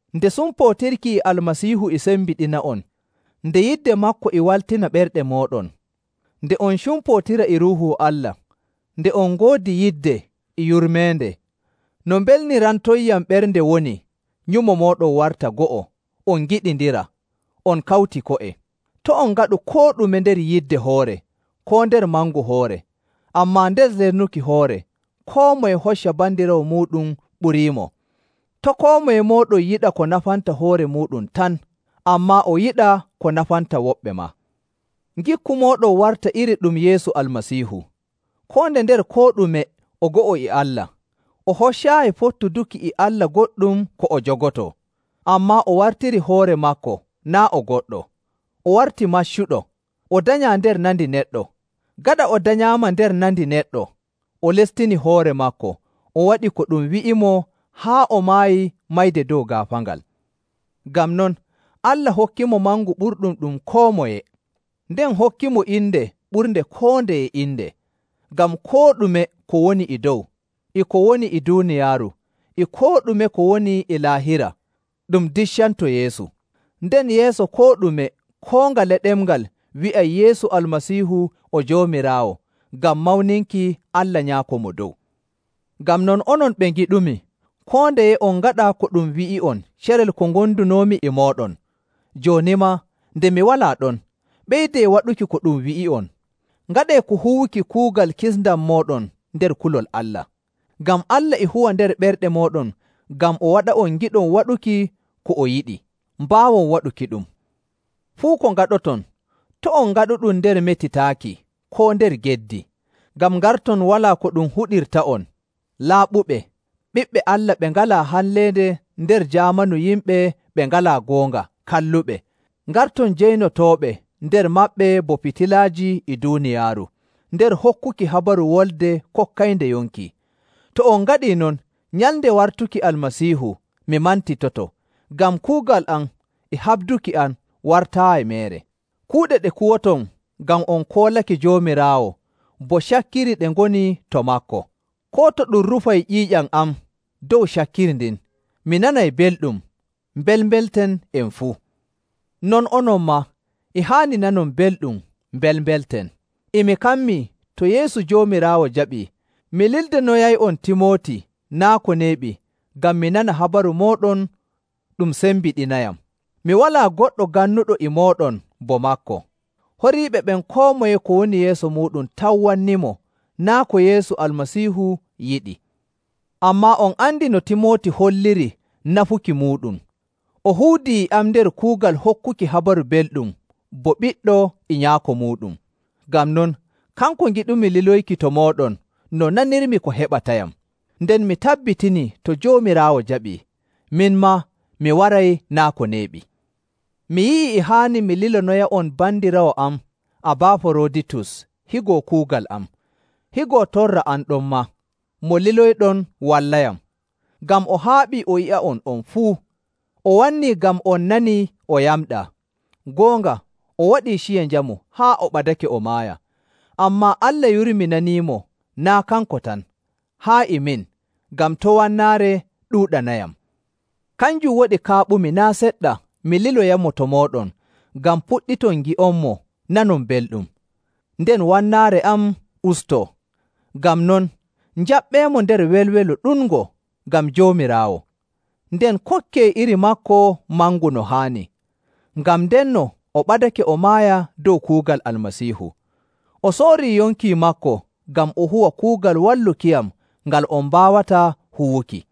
Nde sumpootirki e Almasiihu e sembiɗina'on, nde yidde maako e waltina ɓerɗe mooɗon, nde on cumpootira e Ruuhu Allah, nde on ngoodi yidde e yurmeende, no mbelnirantonyam ɓernde woni nyumo mooɗon warta go'o, on ngiɗindira, on kawti ko'e. To' on ngaɗu koo ɗume nder yidde hoore koo nder mangu hoore, ammaa nder lesnuki hoore koo moye hocca bandiraawo muuɗum ɓuriimo. To' koo moye mooɗon yiɗa ko nafanta hoore muuɗum tan, ammaa o yiɗa ko nafanta woɓɓe maa. Ngikku mooɗon warta iri ɗum Yeesu Almasiihu. Koo nde nder koo ɗume o go'o e Allah, o hoccaayi fottuduki e Allah goɗɗum ko o jogotoo. Ammaa o wartirii hoore maako naa' o goɗɗo, o warti maccuɗo, o danyaa nder nandi neɗɗo. Gaɗa o danyaama nder nandi neɗɗo, o lestini hoore maako o waɗi ko ɗum wi'imo haa o maayi mayde dow gaafaangal. Ngam non, Allah hokkimo mangu ɓurɗum ɗum koo moye, nden hokkimo inde ɓurnde koo ndeye inde. Ngam koo ɗume ko woni e dow, e ko woni e duuniyaaru, e koo ɗume ko woni e Laahira, ɗum diccanto Yeesu. Nden yeeso koo ɗume koo ngale ɗemngal wi'ay Yeesu Almasiihu o Joomiraawo, ngam mawninki Allah Nyaako Mo Dow.. Ngam non onon ɓe ngiɗumi, koo ndeye on ngaɗa ko ɗum wi'i'on carel ko ngondunoomi e mooɗon. Jooni maa nde mi walaa ɗon, ɓeydee waɗuki ko ɗum wi'i'on. Ngaɗee ka huwuki kuugal kisndam mooɗon nder kulol Allah. Ngam Allah e huwa nder ɓerɗe mooɗon ngam o waɗa'on ngiɗon waɗuki ko o yiɗi, mbaawon waɗukiɗum. Fuu ko ngaɗoton, to' on ngaɗuɗum nder metitaaki, koo nder geddi, ngam ngarton walaa ko ɗum huɗirta'on, laaɓuɓe, ɓiɓɓe Allah ɓe ngalaa halleende nder jaamanu yimɓe ɓe ngalaa goonga kalluɓe, ngarton jaynotooɓe nder maɓɓe bo fitilaaji e duuniyaaru,. nder hokkuki habaru wolde kokkaynde yonki.: Koo boo: “on jogii wolde yonki boɗɗum.” To on ngaɗii non, nyalnde wartuki Almasiihu mi mantitoto, ngam kuugal am e haɓduki am wartaayi meere. Kuuɗe ɗe kuwoton ngam on koolake Joomiraawo, bo cakkiri ɗe ngoni to maako. Koo to ɗum rufay ƴiiƴam am dow cakkiri ndin, mi nanay belɗum, mbelmbelten en fuu. Non onon maa, e haani nanon belɗum, mbelmbelten. E mi kammii, to Yeesu Joomiraawo jaɓii, mi lildonoyay'on Timooti naa' ko neeɓi ngam mi nana habaru mooɗon ɗum sembiɗinayam. Mi walaa goɗɗo gannuɗo e mooɗon bo maako. Horiiɓe ɓen koo moye ko woni yeeso muuɗum tan wannimo, naa' ko Yeesu Almasiihu yiɗi. Ammaa on andi no Timooti holliri nafuki muuɗum, o huudii e am nder kuugal hokkuki Habaru Belɗum bo ɓiɗɗo e nyaako muuɗum. Ngam non, kanko ngiɗumi liloyki to mooɗon no nanirmi ko heɓatayam. Nden mi tabbitinii, to Joomiraawo jaɓii, min maa mi waray naa' ko neeɓi. Mi yi'ii e haani mi lilonoya'on bandiraawo am Abaaforoditus higo kuugal am, higo torra am ɗonmaa, mo liloyɗon wallayam. Ngam o haaɓii o yi'a'on on fuu, o wannii ngam on nanii o yamɗaa. Goonga o waɗii ciya njamu haa o ɓadake o maaya. Ammaa Allah yurminaniimo, naa' kanko tan, haa e min, ngam to' wannaare ɗuuɗanayam. Kanjum waɗi kaaɓumi naa' seɗɗa mi liloyamo to mooɗon ngam puɗɗiton ngi'onmo nanon belɗum, nden wannaare am ustoo. Ngam non, njaɓɓeemo nder welwelo ɗuɗngo ngam Joomiraawo, nden kokkee iri maako mangu no haani. Ngam ndenno o ɓadake o maaya dow kuugal Almasiihu. O soorii yonki maako ngam o huwa kuugal wallukiyam ngal on mbaawataa huwuki.